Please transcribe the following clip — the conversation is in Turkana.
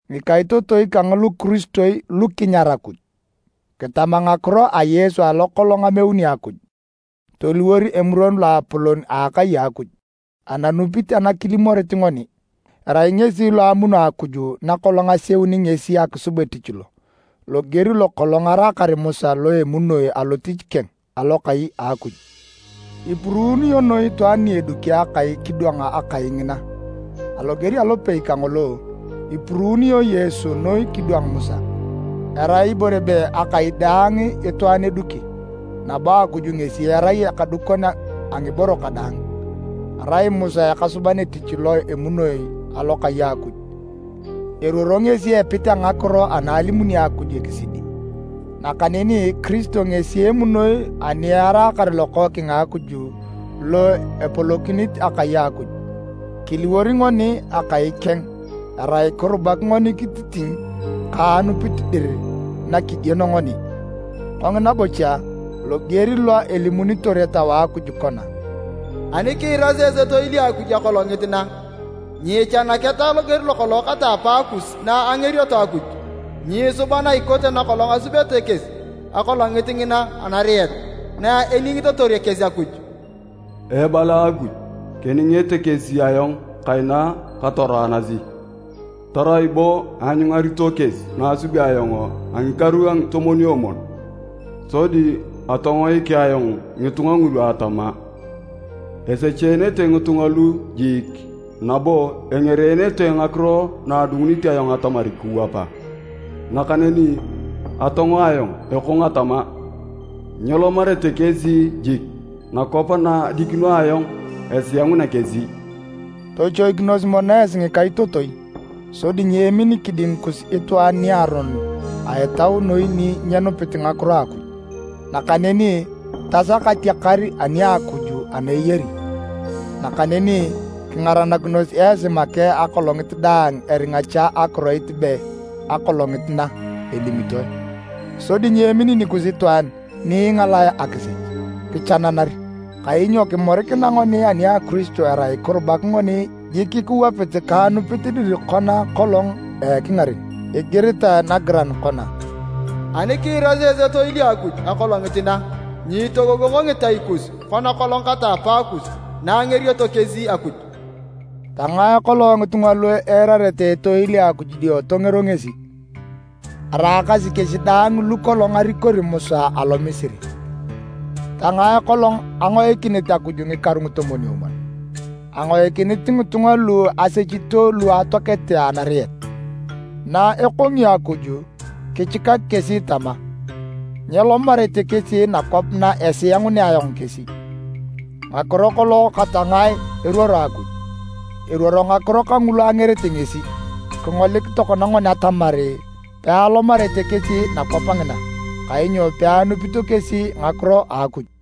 Ngikaitotoi kang lukiristoi lu kinyar Akuj! Kitama ngakiro a Yesu alo kolong ameuni Akuj toliwor Emuron Loapolon a akai a Akuj a anupit ana kilimorit ngoni. Arai ngesi lo amuno Akuj na kolong aseuni ngesi akisub etich lo, loger lo kolong araakar Musa lo emunoi alotich keng, Alokai a Akuj. Ipuruunio noi itwaan ni aduki akai kidwang akai ngina. Aloger alopei kangolo, ipuruunio Yesu noi kidwang Musa. Erai ibore be akai daang itwaan eduki, nabo Akuj ngesi erai akadukon a ngiboro kadaang. Arai Musa ekasuban etich lo emunoi alokai a Akuj. Eruoro ngesi epit a ngakiro ana elimuni Akuj ekisidi. Nakaneni Kiristo ngesi emunoi ani eraakar Lokookeng a Akuj lo epolokinit akai a Akuj. Kiliwor ngoni akai keng erai kirubak ngoni kititiny ka anupit dir na kigieno ngoni. Kongina bocha, loger lo elimunitor Etau a Akuj kona, “Ani kiirasi etoil a Akuj akolongit na, nyiichanaketa loger lokolong kata apaakus na angerioto Akuj. Nyiisuba na ikote na kolong asubete kesi akolongit ngina anariet, na eningitotor kesi Akuj. Ebala Akuj, keningete kesi ayong kaina katoroanasi, tarai bo aanyungarito kesi na asubi ayong a ngikaru a ngitomwon-omwon. Sodi atongoik ayong ngitunga ngulu atama, ‘Esecheenete ngitunga lu jiik, nabo engereenete ngakiro na adungunit ayong atamar kiwapa.’ Nakaneni atongo ayong ekong atama, ‘Nyelomarete kesi jik nakwap na adikino ayong esiangunea kesi!’” Tochoikinos mono esi ngikaitotoi sodi nyeemin kiding kus itwaan niaronon a etau noi ni nyenupit ngakiro a Akuj, nakaneni tasak atiakar ani a Akuj ana eyari. Nakaneni kingaranakinos esi make akolongit daang eringa cha akiroit be “Akolongit na” elimitoe. Sodi nyeemin nikus itwaan ni ingalae akisech, kichananer. Kainyo kimorikina ngoni ani a Kiristo erai kirubak ngoni jik kiwapit ka akinup dir kona kolong a ekingaren. Igiritae nagiran kona, “Ani kiirasi esi etoil a Akuj akolongit na, nyiitogogongo ngitai kus, kona kolong kata apaakus, na angerioto kesi Akuj.” Tangae kolong ngitunga lu eirarete etoil a Akuj dio tongero ngesi? Araakasi kesi daang lu kolong arikori Musa alo Misiri. Tangae kolong angoikinit Akuj ngikaru ngitomwon-omwon? Angoikinit ngitunga lu asechito lu atoakete anariet. Na ekongio Akuj kichikak kesi tama, “Nyelomarete kesi nakwap na esiangunea ayong kesi”, ngakiro kolong kata ngae eruoro Akuj? Eruoro ngakiro kangulu angerete ngesi. Kingolik tokona ngoni atamar pealomarete kesi nakwap ngina, kainyo peanupito kesi ngakiro a Akuj.